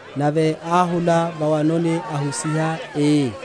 nave áhula va’wanoni, ahusiha, ii: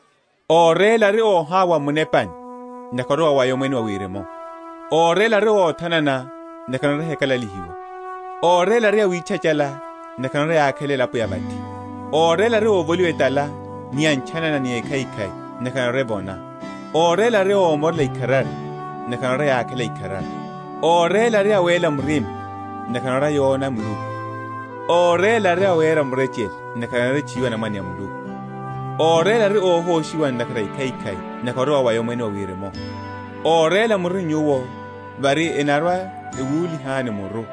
Óréla ari óhawa m’munepani: ntakhara ori wawaya Omwene wa Wirimu. Óréla ari óthanana: ntakhara narwa‐chakalalihiwa. Óréla ari awitchachála: ntakhara enarwa‐yákhela elapo ya vathi. Óréla ari óvoliwa etala ni ntchanana na ekhaikhai: ntakhara enarwa‐evona. Óréla ari ómorela ikharari: ntakhara narwa‐yákhela ikharari. Óréla ari awéla murima: ntakhara enarwa‐yona Muluku. Óréla ari awera murechele: ntakhara enarwa‐etchuwiwa anamwane a Muluku. Óréla ari óhoshiwa ntakhara a ekhaikhai: ntakhara ori wawaya Omwene wa Wirimu. Óréla muri nyuwo, vári enarwa‐ewúlihani muru,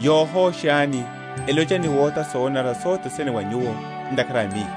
yohoshani, elocha ni wotha sonanara sothene va nyuwo, ntakhara a Miyo.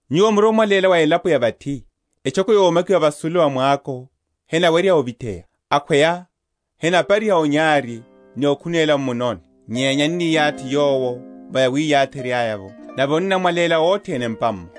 Nyuwo muri omwaléla wa elapo ya vathi. Etchoko yomakiwa vasulu va mwako hewerya ovitheya. Akhweya henapariha onyari, ni okhunéla m’munoni, nyenya eniyathi yowo va yawiyatherya’vo aya; nave onnamwaléla othene m’pa’mmo.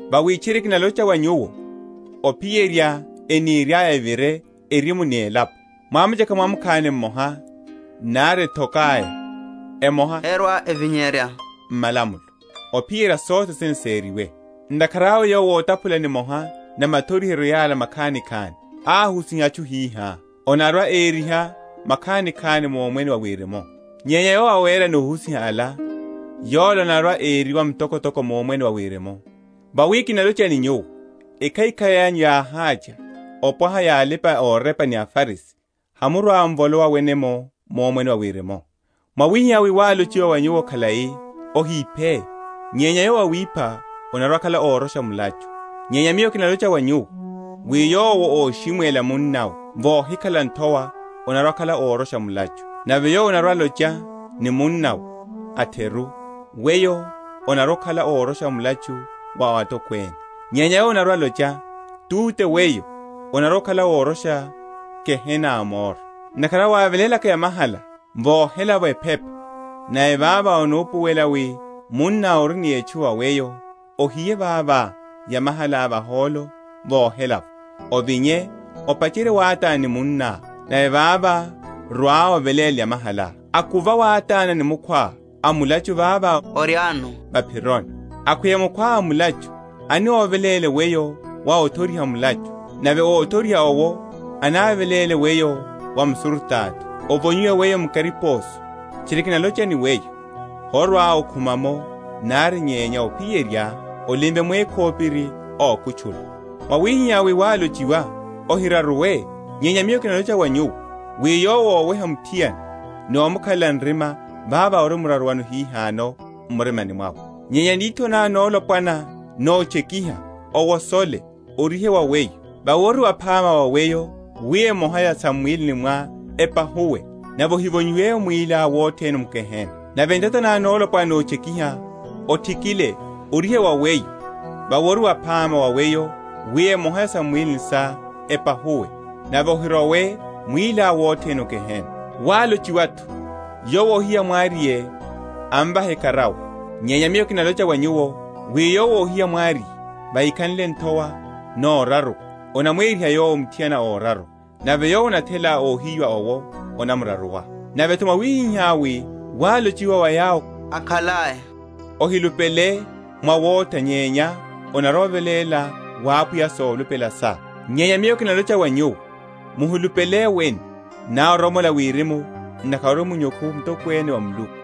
Vawi tchiri kinalocha wa nyuwo, ophiyerya eniriaya evire erimu ni elapo, mwamucheka mwamukhani mmoha nari ethoka’ya emoha herwa‐evinyerya o malamulo, ophiyerya sothene sériwe. Ntakhara awe yowo otaphula nimoha na mathoriheryo yala makhanikhani, ahusiha atchu hihá, anarwa‐eriwa mukhanikhani mu Omwene wa Wirimu; nyenya yowo awera ni ohusiha ala, yola anarwa‐eriwa mtokotoko mu Omwene wa Wirimu. Vawi kinalocha ni nyuwo, ekhaikhai anyu yáhácha opwaha ya alipa‐orepa ni aFarisi, hamurwa‐m’volowa wene mu Omwene wa Wirimu. Mwáhiwa wi wálochiwa wa yawo akhalai, Ohiphe; nyenya yowo awipha anarwa‐akhala órosha mulachu: nyenya Miyo kinalocha wa nyuwo, wi yowo óshimwela munnawe vóhikhala nthowa anarwa‐akhala órosha mulachu; nave yowo anarwa‐alocha ni munnawe, A’theru weyo, anarwa‐akhala órosha mulachu wa atokwene: nyenya yowo anarwa‐alocha. Túte weyo, anarwa‐akhala órosha gehena a moro. Ntakhara awe wávelélaka yamahalá vohela’vo ephepa, nave vavo onupuwela wi munná ori ni etchu va weyo, ohiye vavo yamahalá vahólo vohela’vo, ovinye, opacherye wátana ni munná, nave vavo rwa oveléle yamahalá. Akuva wátana ni mukhwá a mulachu vavá oriáno va’phironi; akhweya mukhwá a mulachu anoveléle weyo wa óthoriha mulachu, nave óthoriha owo anaveléle weyo wa msurutato, ovonyiwe weyo mu kariposo. Tchiri kinalocha ni weyo, horwa‐okhuma’mo nari, nyenya ophiyerya olimve mwékhopiri ókutchula. Mwáhiwa wi wálochiwa, Ohiraruwe: nyenya Miyo kinalocha wa nyuwo, wi yowo óweha muthiana ni omukhalela nrima vavo arimraruwano hihano m’murimani mwawe. Nyenya nitho ná nolopwana nótchekiha, owosole, orihe wa weyo; vawi ori waphama wa weyo wi emoha ya sam’mwílini sá epahuwe, nave ohivonyiwe mwiliá wothene m’gehena. Nave ntata ná nolopwana nótchekiha, othikile, orihe wa weyo; vawi ori waphama wa weyo wi emoha ya sam’mwílini sá epahuwe, nave ohirowe mwiliá wothene o gehena. Wálochiwa’tho, Yowo óhiya mwariye amvahe ekarawa: nyenya Miyo kinalocha wa nyuwo, wi yowo óhiya mwariye, vahikhanle nthowa noraruwa, anamweriha yowo muthiana óraruwa: nave yowo anathela óhiyiwa owo anamraruwa. Nave’tho, mwáhiwa wi wálochiwa wa yawo akhalai, Ohilupele mwawotha nyenya onarwa‐oveléla wa Apwiya solupela sá: nyenya Miyo kinalocha wa nyuwo; Muhilupele wene, nari oromola Wirimu, ntakhara ori munyukhu mtokwene wa Muluku;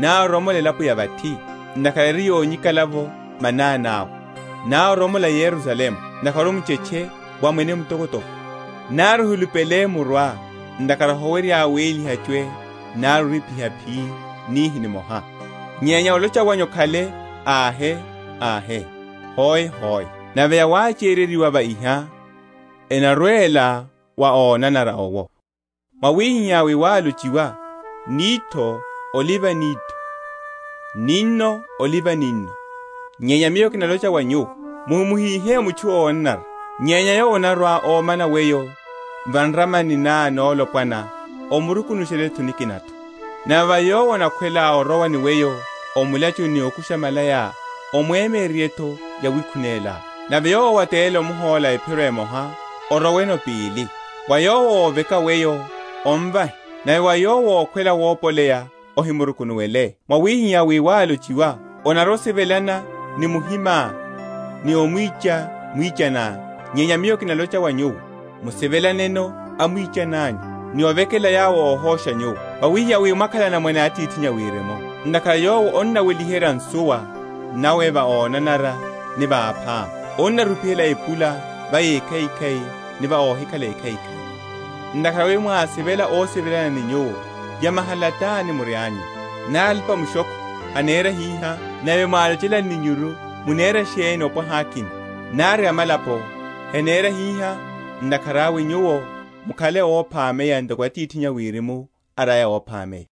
nari oromola elapo ya vathi, ntakhara eri yonyikala’vo manani awe, nari oromola Yerusalemu, ntakhara ori muchetche wa Mwene mtokotoko. Nari ohilupele o muruá, ntakhara howerya wéliha chwee nari orípiha phii nihi nimoha. Nyenya olocha wanyu okhale, Ahe, ahe; hoe, hoe; nave yawachereryiwa va iho enarwela wa onanara owo. Mwáhiwa wi wálochiwa, Nitho oliva nitho, n’ninno oliva ninno: nyenya Miyo kinalocha wa nyuwo, Muhimuhihe mutchu ónanara; nyenya yowo anarwa‐ómana weyo va nramani ná nolopwana, omuruku?-?nushele nikina’tho. Nave wa yowo anakhwela orowa ni weyo o mulachuni ni okusha malayá omwemyererye’tho yawikhunelá. Nave yowo ówatelela omhóla ephiro emoha, oroweno pili. Wa yowo óveka weyo omvahe, nave wa yowo ókhwela wopoleya ohimrukunuwele. Mwáhiwa wi wálochiwa, Onarwa‐osivelana ni muhimá, ni omwicha mwichaniá: nyenya Miyo kinalocha wa nyuwo, musivelaneno amwichani anyu, ni ovekelela yawo óhosha nyuwo; wawihiha wi mwakhale anamwane a Atithinyu a Wirimu; ntakhara Yowo annaweliherya nsuwa nawe va ónanara ni va aphama, anarupihela epula va ékhaikhai ni va óhikhala ékhaikhai. Ntakhara wi mwasivela ósivelana ni nyuwo, yamahala tani murianyuno? nari alipa‐mushokho henera hiha? Nave mwalochela anninyuru, munera sheni opwaha akina? Nari amalapo henera hiha? Ntakhara awe nyuwo mukhale óphameya ntoko Atithinyu a Wirimu ari óphameya.